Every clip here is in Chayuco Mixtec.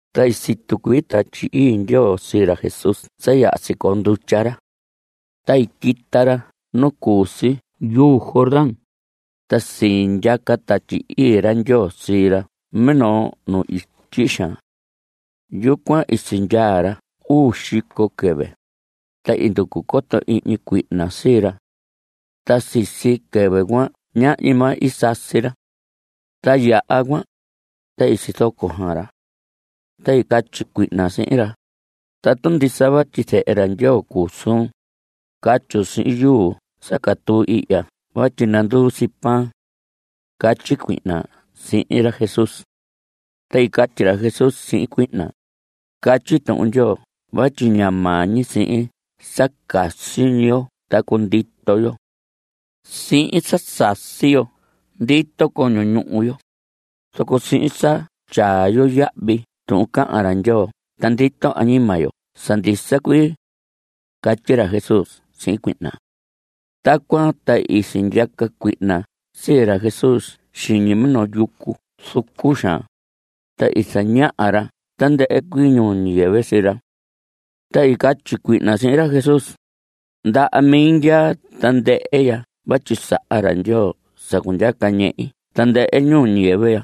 Ta i situ cuii Tatyi Ii Ndyoo sii ra Jesús sa yaha sicoo ndutya ra. Ta i quita ra nu cu si yuu Jordán, ta sindyaca Tatyi Ii ra Ndyoo sii ra minoo nu ityi xaan. Yucuan i sindyaa ra uu xico quɨvɨ, ta i nducu coto ihñi cuihna sii ra. Ta sisi quɨvɨ cuan ñahñi maa i sasi ra. Ta yaha cuan, ta i sizoco xaan ra. Ta i catyi cuihna sihin ra: Tatu ndisa vatyi Zehe ra Ndyoo cuu suun, catyun sihin yuu sa catuu ihya vatyi nanduu si pan. Catyi cuihna sihin ra Jesús. Ta i catyi ra Jesús sihin cuihna: Catyi Tuhun Ndyoo vatyi ña maa sihin sa casi ñi yo ta cundito yo. Sihin sa sasi yo ndito coño ñuhu yo, zoco sihin sa tyaa yo yahvi tuhun cahan ra Ndyoo ta ndito añima yo sa ndisa cuii. Catyi ra Jesús sihin cuihna. Tacuan ta i sindyaca cuihna sii ra Jesús xiñi minoo yucu zucu xaan, ta i zañaha ra tandɨhɨ cuii ñuu ñiyɨvɨ sii ra. Ta i catyi cuihna sihin ra Jesús: Ndaha mi ndyaa tandɨhɨ ya vatyi saha ra Ndyoo sa cundyaca ñehi tandɨhɨ ñuu ñiyɨvɨ ya.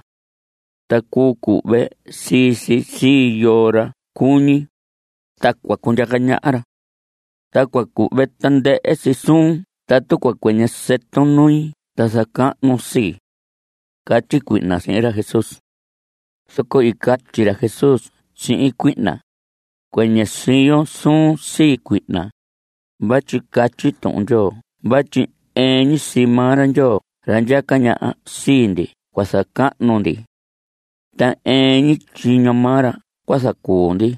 Ta cuu cuhve sii si sii yoo ra cuñi, ta cua cundyaca ñaha ra. Ta cua cuhve tandɨhɨ si suun tatu cua cuɨñɨ sɨtun nui ta zacahnun sii. Catyi cuihna sihin ra Jesús. Zoco i catyi ra Jesús sihin cuihna: Cuɨñɨ siyo suun sii, cuihna, vatyi catyi Tuhun Ndyoo vatyi ɨɨn ñi sii maa ra Ndyoo ra ndyaca ñaha sii ndi cua zacahnu ndi. Ta ɨɨn ñi tyiño maa ra cua zacuu ndi.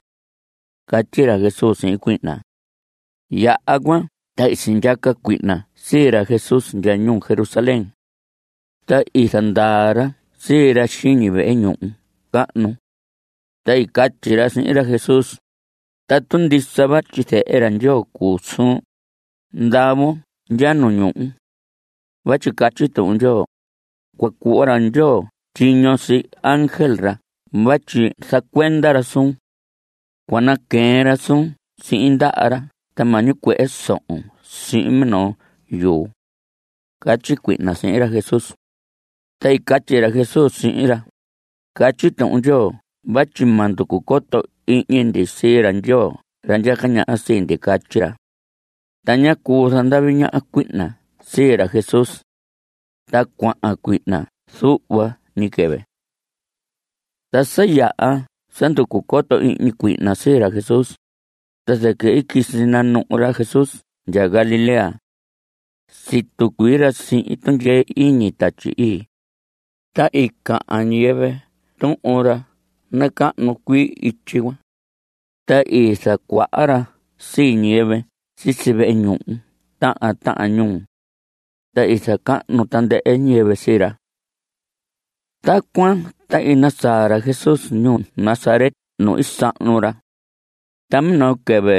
Catyi ra Jesús sihin cuihna. Yaha cuan ta i sindyaca cuihna sii ra Jesús ndya ñuu Jerusalén. Ta i zandaa ra sii ra xiñi vehe ñuhu cahnu. Ta i catyi ra sihin ra Jesús: Tatu ndisa vatyi Zehe ra Ndyoo cuu suun, ndavon ndya nu ñuhu. Vatyi catyi Tuhun Ndyoo: “Cua cuhva ra Ndyoo tyiño sii ángel ra vatyi zacuenda ra suun. Cua naqueen ra suun sihin ndaha ra ta ma ñicuehe sohon sihin minoo yuu.” Catyi cuihna sihin ra Jesús. Ta i catyi ra Jesús sihin ra: Catyi Tuhun Ndyoo vatyi ma nducu coto ihñi ndi sii ra Ndyoo ra ndyaca ñaha sii ndi. Catyi ra. Ta ñá cuu zandavi ñaha cuihna sii ra Jesús. Ta cuahan cuihna zuhva ñi quɨvɨ. Ta sa yaha sa nducu coto ihñi cuihna sii ra Jesús, ta zɨquɨ i quisi nanuhu ra Jesús ndyaa Galilea. Situ cuii ra sihin tundyee iñi Tatyi Ii. Ta i cahan ñiyɨvɨ tuhun ra nacahnu cuii ityi cuan. Ta i zacuaha ra sii ñiyɨvɨ sisi vehe ñuhu tahan tahan ñuu. Ta i zacahnu tandɨhɨ ñiyɨvɨ sii ra. Tacuan ta i nasaa ra Jesús ñuu Nazaret nu i sahnu ra. Ta minoo quɨvɨ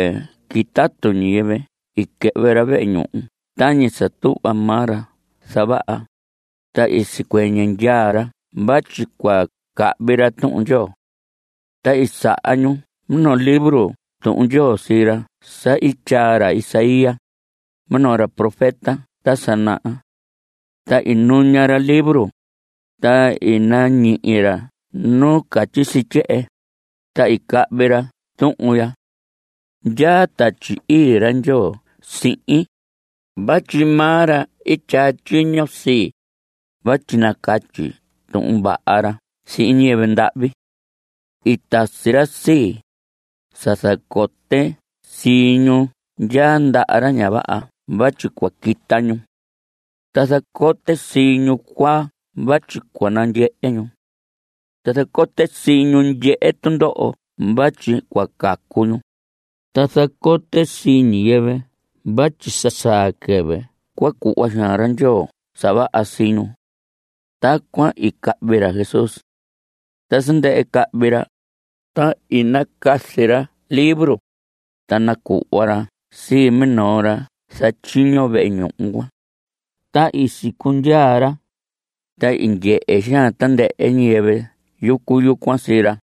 quitatu ñiyɨvɨ i quɨhvɨ ra vehe ñuhu tañi sa tuhva maa ra zavaha, ta i sicuɨñɨ ndyaa ra vatyi cua cahvi ra Tuhun Ndyoo. Ta i saha ñu minoo libro Tuhun Ndyoo sii ra sa i tyaa ra Isaías, minoo ra profeta ta sa naha. Ta i nuña ra libro, ta i nañihi ra nu catyi si tyehen, ta i cahvi ra tuhun ya: Ndyaa Tatyi Ii ra Ndyoo sihin, vatyi maa ra i tyaa tyiño sii, vatyi nacatyi tuhun vaha ra sihin ñiyɨvɨ ndahvi. I tasi ra sii, sa zacote sii ñu ndyaa ndaha ra ña vaha vatyi cua quita ñu. Ta zacote sii ñu cuaa vatyi cua nandyehe ñu. Ta zacote sii ñu ndyehe tundoho vatyi cua cacu ñu. Ta zacote sii ñiyɨvɨ vatyi sa saa quɨvɨ cua cuhva xaan ra Ndyoo sa vaha sii ñu. Tacuan i cahvi ra Jesús. Ta sa ndɨhɨ cahvi ra, ta i nacazi ra libro, ta nacuhva ra sii minoo ra zatyiño vehe ñuhu cuan. Ta i sicundyaa ra. Ta i ndyehe xaan tandɨhɨ ñiyɨvɨ yucu yucuan sii ra.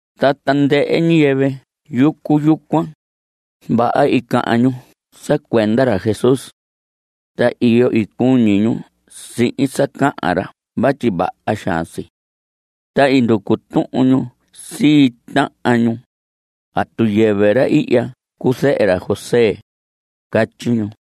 Ta tandɨhɨ ñiyɨvɨ yucu yucuan, vaha i cahan ñu sa cuenda ra Jesús. Ta iyo cuñi ñu sihin sa cahan ra vatyi vaha xaan si. Ta i nducu tuhun ñu sii tahan ñu: ¿Atu yɨvɨ ra ihya cuu zehe ra José? Catyi ñu.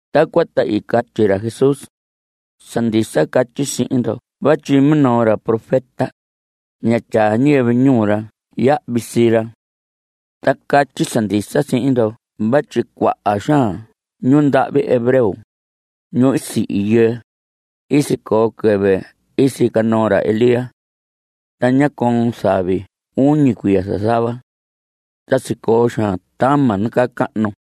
Tacuan ta i catyi ra Jesús: Sa ndisa catyi sihin ndo vatyi minoo ra profeta, ña tyaa ñiyɨvɨ ñuu ra yahvi sii ra. Ta catyi sa ndisa sihin ndo vatyi cuaha xaan ñundahvi hebreo, ñu sihi yɨɨ, i sicoo quɨvɨ i sica noo ra Elías. Ta ñá coon zavi uñi cuiya zazava. Ta sicoo xaan tama nacahnu.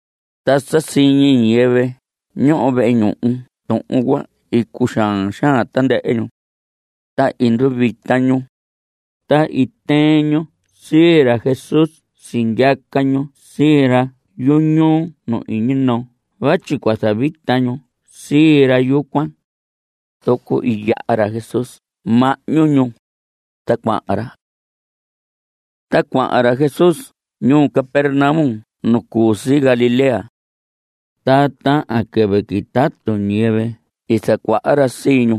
Ta sa siñi ñiyɨvɨ ñoho vehe ñuhu tuhun cuan, i cuxaan xaan tandɨhɨ ñu. Ta i nduvita ñu. Ta i tɨɨn ñu sii ra Jesús sindyaca ñu sii ra yuñuu nu iñi noo vatyi cua zavita ñu sii ra yucuan. Zoco i yaha ra Jesús mahñu ñu, ta cuahan ra. Ta cuahan ra Jesús ñuu Capernaum nu cu si Galilea. Ta tahan quɨvɨ quitatu ñiyɨvɨ i zacuaha ra sii ñu.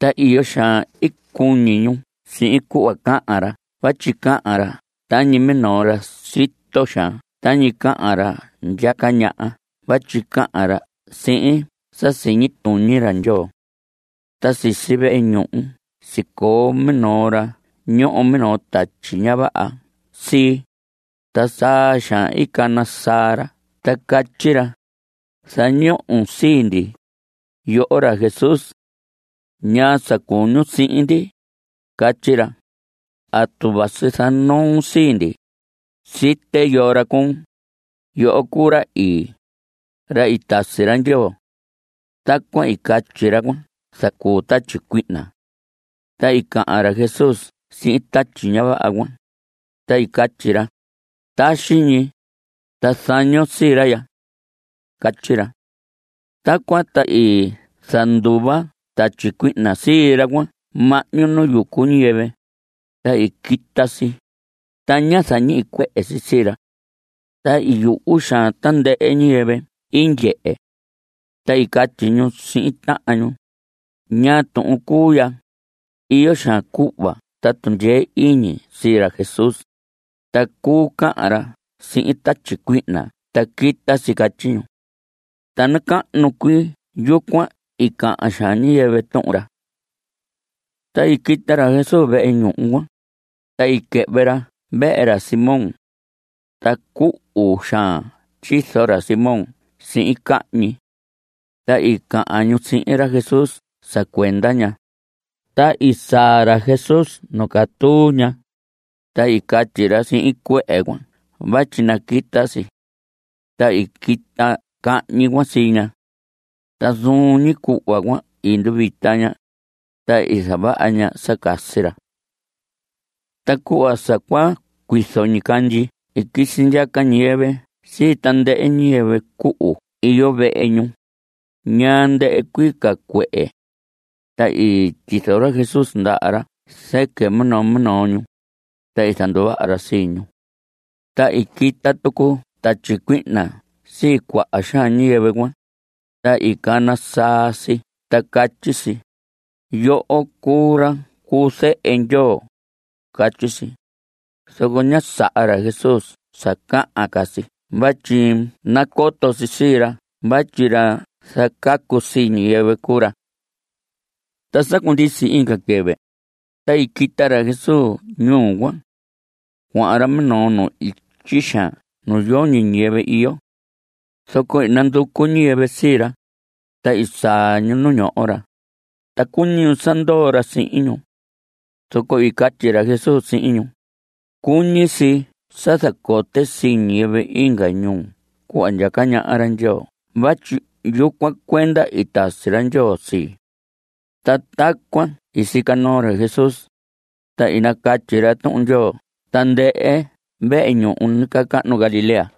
Ta iyo xaan i cuñi ñu sihin cuhva cahan ra vatyi cahan ra tañi minoo ra sito xaan tañi cahan ra ndyaca ñaha vatyi cahan ra sihin sa siñi tuñi ra Ndyoo. Ta sisi vehe ñuhu sicoo minoo ra ñoho minoo tatyi ña vaha sii, ta saa xaan i cana saa ra ta catyi ra: Zañon sii ndi, yoho ra Jesús. ¿Ñaa sa cuñun sihin ndi? Catyi ra. ¿Atu vasi zanoon sii ndi? Site yoo ra cuun. Yoho cuu ra Ii, ra tasi ra Ndyoo. Tacuan i catyi ra cuan zacuu tatyi cuihna. Ta i cahan ra Jesús sihin tatyi ña vaha cuan, ta i catyi ra: Taxi ñi, ta zañon sii ra ya. Catyi ra. Tacuan ta i zanduva tatyi cuihna sii ra cuan mahñu nu yucu ñiyɨvɨ, ta i quita si, ta ñá zañicuehe si sii ra. Ta i yuhu xaan tandɨhɨ ñiyɨvɨ i ndyehe. Ta i catyi ñu sihin tahan ñu: ¿Ñaa tuhun cuu ya? Iyo xaan cuhva ta tundyee iñi sii ra Jesús, ta cuu cahan ra sihin tatyi cuihna ta quita si. Catyi ñu. Ta nacahnu cuii yucuan i cahan xaan ñiyɨvɨ tuhun ra. Ta i quita ra Jesús vehe ñuhu cuan, ta i quɨhvɨ ra vehe ra Simón. Ta cuhu xaan tyizo ra Simón sihin cahñi. Ta i cahan ñu sihin ra Jesús sa cuenda ña. Ta i saa ra Jesús nu catuu ña, ta i catyi ra sihin cuehe cuan vatyi naquita si. Ta i quita cahñi cuan sii ña. Ta zuun ñi cuhva cuan i nduvita ña, ta i zavaha ña sa casi ra. Ta cuhva sa cua cuizo ñicandyi i quisi ndyaca ñiyɨvɨ sii tandɨhɨ ñiyɨvɨ cuhu iyo vehe ñu, ñaa ndɨhɨ cuii ca cuehe. Ta i tyizo ra Jesús ndaha ra zɨquɨ minoo minoo ñu, ta i zanduvaha ra sii ñu. Ta i quita tucu tatyi cuihna sii cuaha xaan ñiyɨvɨ cuan, ta i cana saa si ta catyi si: Yoho cuu ra cu Zehe Ndyoo. Catyi si. Zoco ñá saha ra Jesús sa cahan ca si vatyi nacoto si sii ra vatyi ra zacacu sii ñiyɨvɨ cuu ra. Ta sa cundisi inga quɨvɨ, ta i quita ra Jesús ñuu cuan. Cuahan ra minoo nu ityi xaan nu yoñi ñiyɨvɨ iyo. Zoco i nanducu ñiyɨvɨ sii ra, ta i saa ñu nu ñoho ra, ta cuñi ñu sa ndoo ra sihin ñu. Zoco i catyi ra Jesús sihin ñu: Cuñi si sa zacote sii ñiyɨvɨ inga ñuu cuhva ndyaca ñaha ra Ndyoo vatyi yucuan cuenda i tasi ra Ndyoo sii. Ta tacuan i sica noo ra Jesús, ta i nacatyi ra Tuhun Ndyoo tandɨhɨ vehe ñuhu nacahnu Galilea.